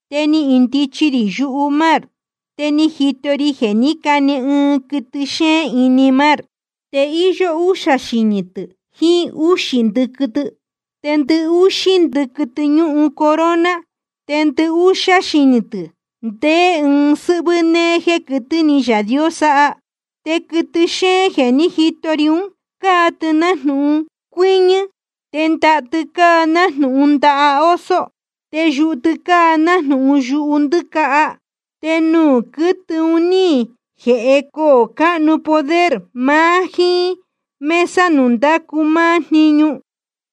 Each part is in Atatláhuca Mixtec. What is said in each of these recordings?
Te ni indichi rī yumár. Te ni jito ri jeē ní cane ɨɨn quɨtɨ xéén ini mar. Te íyó úxā xinī tɨ̄ jiín úxī ndɨquɨ tɨ. Te ndɨhúxí ndɨquɨ tɨ ñúhun corona. Te ndɨhúxá xinī tɨ̄ ndeé ɨɨn sɨ́hvɨ́ néé jéē quɨtɨ́ ni Yaā Dios sáha. Te quɨtɨ xéén jeē ní jito ri ún, cáa tɨ nájnūhun cuɨñɨ̄, te ndaha tɨ cáa nájnūhun ndaha oso, te yuhu tɨ cáa nájnūhun yuhu ndɨ́caha. Te nuū quɨtɨ un ní jēhe coō cáhnu poder maá jíín mesa nuū ndácu máá jniñu.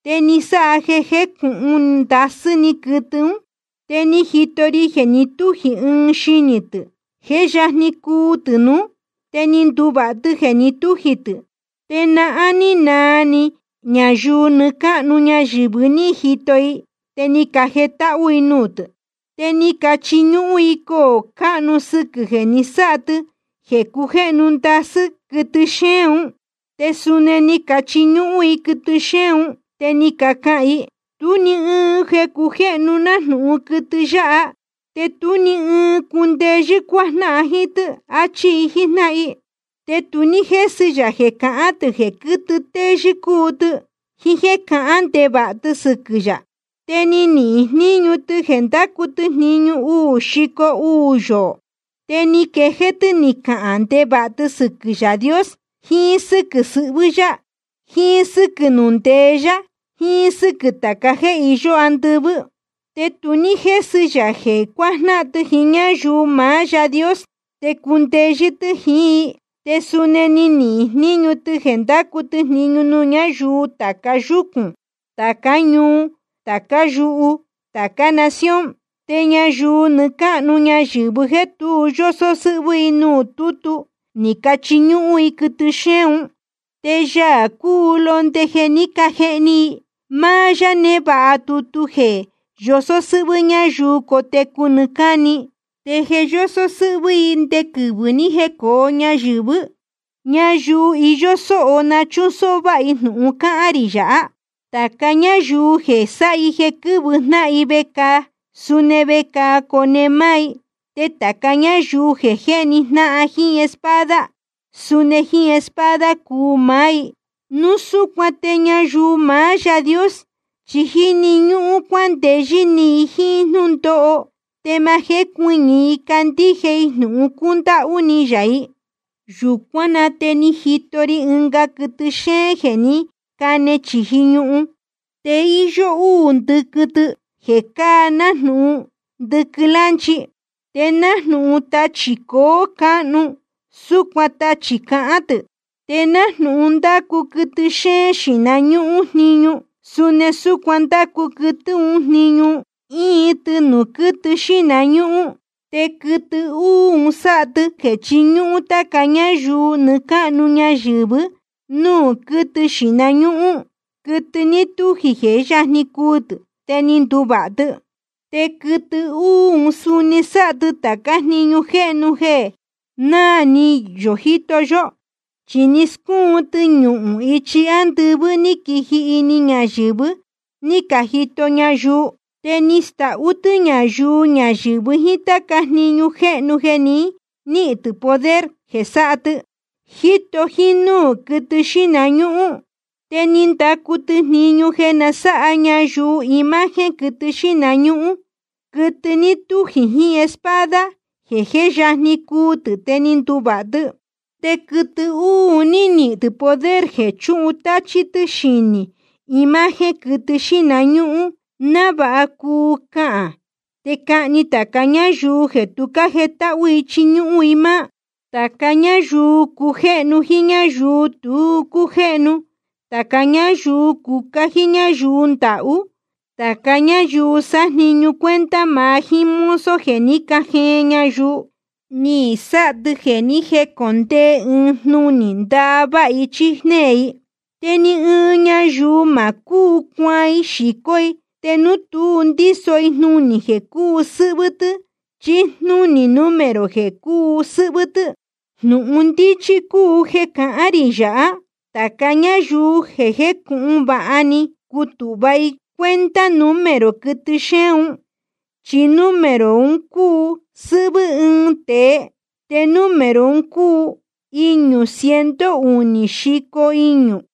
Te ni sáha jeē cujéhnu ndasɨ́ quɨtɨ ún. Te ni jito ri jeē ni tújī ɨɨn xinī tɨ̄, jeē jé yajni cuu tɨ̄ nuú. Te ni nduvāha tɨ jeē ni tújī tɨ̄. Te nahán ní naa ni ñayuu nɨɨ́ cáhnu ñayɨ̄vɨ ní jito i, te ni cajetáhú i nuū tɨ̄. Te ni cachiñúhún i coō cáhnu sɨquɨ̄ jeē ni sáha tɨ jeē cujéhnu ndasɨ́ quɨtɨ xéén un, te suni ni cachiñúhún i quɨtɨ xéén un. Te ni cacahān i: Tú ni ɨɨn jeē cujéhnu nájnūhun quɨtɨ yáha, te tú ni ɨɨn cundeyɨ́ cuajnáhan jíín tɨ́, áchí i jíjnáhan i. Te tu ní jésɨ ya jeē cahān tɨ̄ jeē quɨ́tɨ téyɨ́ cúu tɨ, jíín jéē cahán ndevāha tɨ sɨquɨ̄ yā. Te ni nihīn jníñu tɨ jeē ndácu tɨ jniñu uū xico uū yoō. Te ni quejéé tɨ́ ni cahān ndevāha tɨ sɨquɨ̄ Yaā Dios, jiín sɨ́quɨ̄ sɨhvɨ́ yá, jiín sɨ́quɨ̄ nuū ndeé yá, jiín sɨ́quɨ̄ tāca jéē iyó andɨvɨ́. Te tu ní jésɨ ya jeē cuajnáhan tɨ jíín ñáyuu maá Yaā Dios, te cundeyɨ́ tɨ́ jiín i. Te suni ni nihīn jníñu tɨ jeē ndácu tɨ jniñu nuū ñáyuu tāca yúcūn, tācá ñuu, tācá yuhu, tācá nación. Te ñayuu nɨɨ́ cáhnu ñayɨ̄vɨ jéē tu yósó sɨ́hvɨ́ i nuū tútu, ni cachiñúhún i quɨtɨ xéén un. Te Yaā cúu Londe jeē ní cajehni i, máá yá névāha tutu un jéē yosó sɨ́hvɨ́ ñáyuu cotecu nɨɨ́ cáni, te je yósó sɨ́hvɨ́ i nde quɨvɨ̄ ni jécōo ñayɨ̄vɨ́. Ñayuu iyó sóho na chúsóhó váha i jnūhun cahān rī yāhá. Tāca ñáyuu jeē sáha jeē quɨ́vɨ jnáhan vecāa, suni vecāa cone máá i. Te tāca ñáyuu jeē jéhni jnáhan jíín espada, suni jíín espada cuu maá i. Núu súcuan te ñayuu maá Yaā Dios chi jíni ñúhún cuandeyɨ́ ni i jíín jnúndóho te ma jécuɨñɨ̄ i candíje i jnūhun cúndáhú ni yā i. Yūcuán na te ni jito ri ɨnga quɨtɨ xéén jeē ní cane chīji ñuhun. Te íyó úū ndɨquɨ tɨ jeē cáa nájnūhun ndɨquɨ lánchi. Te nájnūhun tachī coō cáhnu, súcuan tachī cahán tɨ̄. Te nájnūhun ndácu quɨtɨ xéén xīhna ñúhún jniñu, suni súcuan ndácu quɨtɨ uū ún jniñu, íin tɨ nuū quɨtɨ xíhna ñúhún. Te quɨtɨ uū sáha tɨ jeē chiñúhún táca ñáyuu nɨɨ́ cáhnu ñayɨ̄vɨ́ nuū quɨtɨ xíhna ñúhún, quɨtɨ ní tújī jeē jé yajni cuu tɨ̄ te ni nduvāha tɨ. Te quɨtɨ uū suni sáha tācá jniñu jéhnu jeē nahán náā ni yō jíto yó. Chi ni scúun tɨ ñuhūn ichi ándɨvɨ́ ní quiji ini ñayɨ̄vɨ, ní cajito ñayuu. Te ni stahú tɨ́ ñayuu ñayɨ̄vɨ jíín táca jniñu jéhnu jeē ni níhīn tɨ̄ poder jeē sáha tɨ, jíto jínúū quɨtɨ xíhna ñúhún. Te ni ndacu tɨ jniñu jeē na sáha ñayuu imagen quɨtɨ xíhna ñúhún, quɨtɨ ní tújī jiín espada, jeē jé yajni cuu tɨ̄ te ni nduvāha tɨ. Te quɨtɨ uū ni nihīn tɨ̄ poder jeē chutáchí tɨ́ xijnī imagen quɨtɨ xíhna ñúhún, návāha cuu cahān, te cahni tāca ñáyuu jeē tu cájetáhú i chiñúhún i máá. Te tāca ñáyuu cujéhnu jiín ñáyuu tu cújéhnu, tāca ñáyuu cucá jíín ñáyuu ndahú, tāca ñáyuu sájniñu cuenta maá jiín mozo jeē ní cajeen ñayuu, ni sáha tɨ jeē ni jécondee ɨɨn jnunī ndaváha i chí jnéē i. Te ni ɨɨn ñayuu ma cúu cuaan i xīcó i te núu tu ndíso i jnunī jeē cúu sɨ́hvɨ́ tɨ́ chí jnúnī número jeē cúu sɨ́hvɨ́ tɨ́. Jnūhun ndíchí cúu jeē cahán rī yāhá: Tāca ñáyuu jécūhun vāha ni cuu tava i cuenta número quɨtɨ xéén un, chi número un cúu sɨ́hvɨ́ ɨɨn tēe. Te número un cúu iñū ciento unī xico iñū.